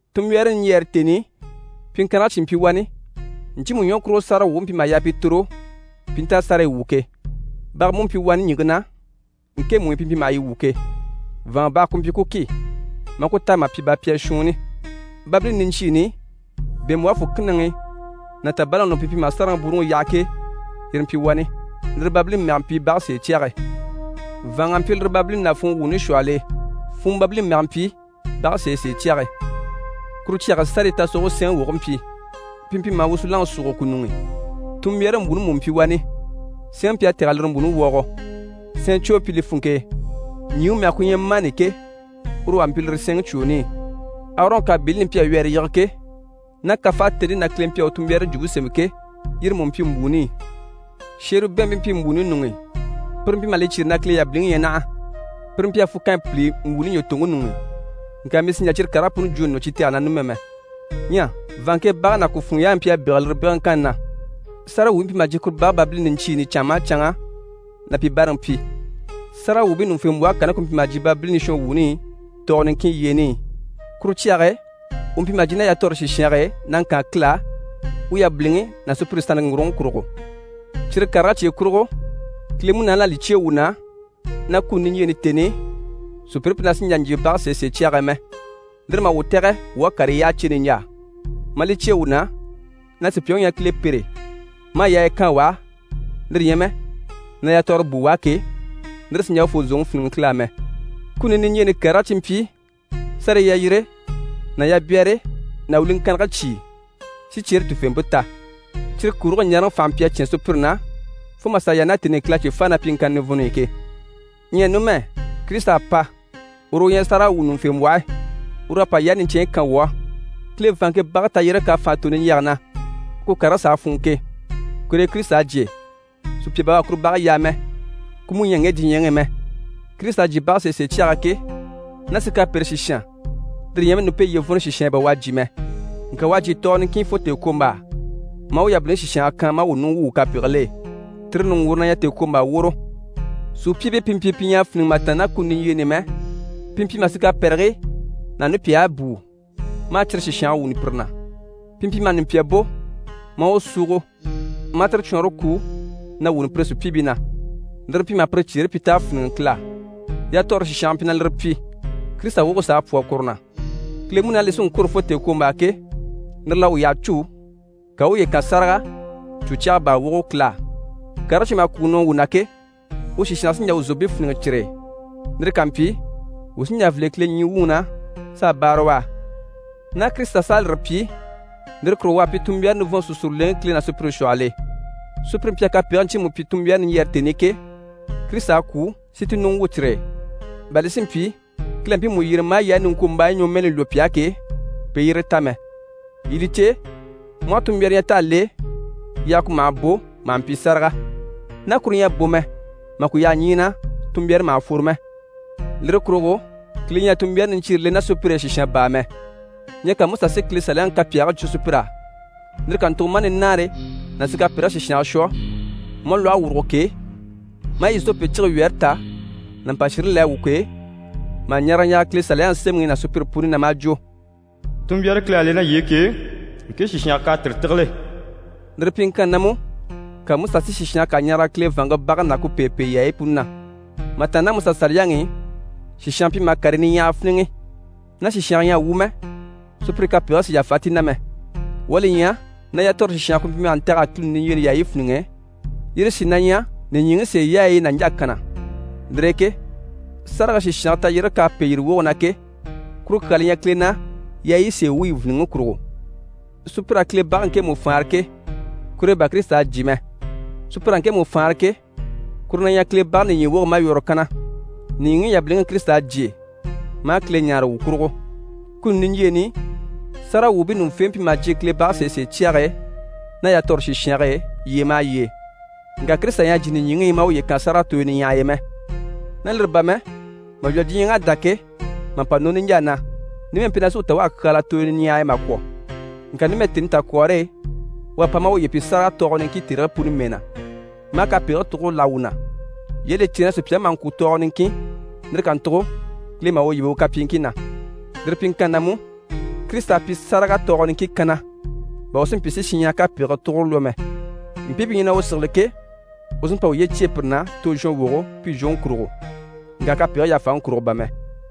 Tunmbyaare niɲjyɛɛre tèni i, pyiŋkannigii cyìi mpyi wani, ɲcyiimu ɲwɔ kurugo sáragawwuubii mpyi maha yaa pi tòro, pi i nta a sárayi wwû ke. Baga mú mpyi wani ɲìŋke na, ŋkemu i pi mpyi maha yi wwû ke. Vàanŋa baga ku mpyi ku ki, maa ku táa mà pyi bapyaa shuunni. Babilini niɲcyiini i bɛ̀ɛnmbwɔhe fùkinaŋi ná tàbalaŋi ɲuŋ'i pi mpyi maha sárage bwúuruŋi yaha ke, yire yi mpyi wani. Lire babilini mɛge mpyi «bage sèecyage». Vàanŋa mpyi lire babilini ná funŋɔ wuuni shwɔhɔl'e. Funŋɔ babilini mɛge mpyi «bage sèesee cyage». Kuru cyage e, sárayi tasogoge sɛɛnŋi woge mpyi, pi mpyi maha wusunaŋi súuge ku ɲuŋ'i. Tunmbyaare mbwùuni mú mpyi wani. Sɛɛnŋi mpyi a tɛ̀g'a lire mbwùuni puni wɔɔgɔ. Sɛɛn cwoo mpyi li funŋke e. Ɲjyìŋi mɛge ku ɲyɛ mani ke, uru wà mpyi lire sɛɛnŋi cwooni i. Arɔn kàbiini li mpyi a wyɛɛre yige ke, ná kafaatente na Kile mpyi a u tunmbyaare jwumpe sémɛ ke, yire mú mpyi mbwùuni i. Sheribɛɛnbii mpyi mbwùuni ɲuŋ'i, pire mpyi maha li cyêre na Kile yabiliŋi ɲyɛ naha. Pire mpyi a fukanyi pìli mbwùuni ɲwɔtoŋke ɲuŋ'i. Ŋka mii sì n‑jà cyire karigii puni jwo nɔ cyi tɛgɛni na numɛ mɛ. Ɲyɛ vàanŋke bage ná ku funŋɔ yaayi mpyi a bégele lire bègeleŋkanni na. Sáragawwuubii mpyi maha jyè kuru bage babilini niɲcyiini i canŋa maha canŋa na pi báaraŋi pyi. Sáragawwuubii ɲùŋufembwɔhe kanni ku mpyi maha jyè babilini shɔnwuuni i tɔɔgɔ niŋkin yyeeni i. Kuru cyage e u mpyi maha ma ná yatɔɔre sìshange e na ŋkaan Kile á, u yabiliŋi ná sùpyire sannte ŋgurugoŋi kurugo. Cyire karigii cye kurugo, Kile Munaani à li cyêe wuu na na kuni niɲjyeeni tèni i, sùpyire mpyi na sì n‑jà n‑jyè bage sèesee cyage e mɛ. Lire maha wuu tɛ̀gɛ wuu à karii yyaha cè niɲjaa, maa li cyêe wuu na na sùpyaŋi u ɲyɛ na Kile pêre maa yaaya kaan u á, lire ɲyɛ mɛ na yatɔɔre bùu u á ke, lire sì n‑jà urufoo zòŋi fíniŋɛ Kile á mɛ. Kuni niɲjyeeni karigii cyi mpyi sárayi yalyire ná yabyɛɛre ná wiliŋkannigii cyìi, si cyeere tufeempe ta. Cyire kurigii ɲaaraŋi fànhe mpyi a cyán sùpyire na fo mà sà yaa ná tèni i Kile à cyi fáa ná pyiŋkanni nivɔnni i ke. Ɲyɛ numɛ, Kirisita à pa. Uru u ɲyɛ sáragawwuɲuŋufembwɔhe, uru u à pa yaayi niɲcɛnɲyi kan wuu á. Kile vàanŋke bage tayyérege k'à fànha tò niɲjyɛge na, ku karigii s'a fûnŋɔ ke, kur'e Kirisita à jyè. Sùpya bà u à kuru bage yaa mɛ, ku mú ɲyɛ ŋge diɲyɛŋi i mɛ. Kirisita à jyè bage sèesee cyage e ke, ná sikapere sìshan, lire ɲyɛ mɛ nupeelyevɔnnɔ sìshan e bà u à jyè mɛ. Ŋka u à jyè tɔɔgɔ niŋkin fo tèekwombaa maa u yabiliŋi sìshange kan maa wuu ɲùŋɔ wwû wuu kapegigil'e. Tire ɲùŋgwuure na ɲyɛ tèekwombaa woro. Sùpyiibii pi mpyi pi ɲyɛ a fíniŋɛ mà tàanna ná kuni niɲjyeeni i mɛ, pi mpyi maha sikapɛrigii ná nupyahigii bùu, maa cyire sìshange wuuni pire na. Pi mpyi maha nùpya bò maa u súugo, maa tire cwɔɔnre kuu na wuni pire sùpyiibii na. Lire mpyi maha pire cyeere pyi t'à fíniŋɛ Kile á. Yatɔɔre sìshange mpyi na lire pyi, Kirisita woge s'à pwɔ́rɔ kuru na. Kile Munaani li sí n-kwôro fo tèekwombaa ke, lire l'à u yyaha cû, ka u u uye kan sáraga cwò cyaga baa wogo Kile á. Karigii cyi maha kwùŋi nɔ wuu na ke, u sìshange sí n‑jà wuu zòompii fíniŋɛ cyire e. Lire ká mpyi, wuu sí n‑jà n‑file Kile ɲyii wuŋi na, s'a báara u á. Ná Kirisita s'à lire pyi, lire kurugo u à pyi tunmbyaare nivɔnnte sùsuruleŋi Kile ná sùpyire shwɔhɔl'e. Sùpyire mpyi a kapegigii ɲcyiimu pyi tunmbyaare niɲjyɛɛre tèni i ke, Kirisita à kwû si ti ɲùŋɔ wwû cyire e, bà li si mpyi Kile à mpiimu yyere maa yaayi niŋkwombaayi ɲwɔmɛɛni lwɔ́ pi á ke, pi i yire ta mɛ. Yii li cè, mu aha tunmbyaare ɲya t'à le, yaaga ku maha bò maha mpyi sáraga. Ná kuru ɲyɛ a bò mɛ, mà ku yaha ɲyii na, tunmbyaare maha fworo mɛ. Lire kurugo Kile ɲyɛ a tunmbyaare niɲcyiire le ná sùpyire e sìshan baa mɛ. Ɲyɛ ka Musa si Kile Saliyaŋi kapyaagii jwo sùpyir'á, lire kàntugo maa nunaare ná sikapɛrigii sìshange shwɔ, maa lwɔhe wùrugo k'e, maa izope cige wyɛɛre tà ná mpà shire le a wu k'e, mà ɲaraga ɲaraga Kile Saliyaŋi Semɛŋi ná sùpyire puni na, maa jwo: «Tunmbyaare Kile à le ná yii e ke, ŋke sìshange k'à tire tígile.» Lire pyiŋkanni na mú, ka Musa si sìshange kà ɲaraga Kile vàanŋke bage ná Kile pêepee yaayi puni na. Mà tàanna ná Musa Saliyaŋi i, sìshange mpyi maha karii niɲyahagii fíniŋɛ. Ná sìshanga ɲyɛ a wu mɛ, sùpyire kapegigii sì yàfa ti na mɛ. Wuu à li ɲya na yatɔɔre sìshange ku mpyi maha ntɛ̀g'a kuni niɲjyeeni yaayi fíniŋɛ, yire sí na ɲyɛ nìɲyiŋi sèeyaayi nàɲja kanna. Lire e ke sárage sìshange tayyérege k'à pêe yire woge na ke, kuru kyaa li ɲyɛ Kile na yaayi sèe wuyi vìniŋi kurugo. Sùpyir'à Kile bage ŋkemu faanra ke, kur'e bà Kirisita à jyè mɛ. Sùpyir'à ŋkemu faanra ke, kuru na ɲyɛ Kile bage nìɲyi woge malwɔrɔ kanna. Nìɲyiŋi yabiliŋi i Kirisita à jyè maa Kile ɲáare wuu kurugo. Kuni niɲjyeeni i, sáragawwuubii ɲùŋufembwɔhe mpyi maha jyè Kile bage sèesee cyage e ná yatɔɔre sìshange e yyee maha yyee, ŋka Kirisita ɲyɛ a jyè nìɲyiŋi i maa uye kan sáraga tooyo niɲyahay'e mɛ. Ná lire bà mɛ, mà lwɔ́ diɲyɛŋ'à dá ke, mà pa nɔ niɲjaa na, numɛ mpyi na sí u ta u à kyaala tooyo niɲyahay'e mà kwɔ̀. Ŋka numɛ tèni takwɔɔre e, u à pa maa uye pyi sáraga tɔɔgɔ niŋkin tèrigii puni mɛɛ na, maa kapegigii tugure láha wuu na. Yii à li cè na sùpyaŋi maha ŋkwû tɔɔgɔ niŋkin, lire kàntugo Kile maha u yíbe u kapyiiŋkii na. Lire pyiŋkanni na mú, Kirisita à pyi sáraga tɔɔgɔ niŋkin kanna, bà u si mpyi si shinɲyahara kapegigii tugure lwɔ́ mɛ. Mpii pi ɲyɛ na u sigili ke, u sí n‑pa uye cyêe pire na tozhɔnwogo pi zhwoŋi kurugo, ŋka kapegigii yàfaŋi kurugo bà mɛ.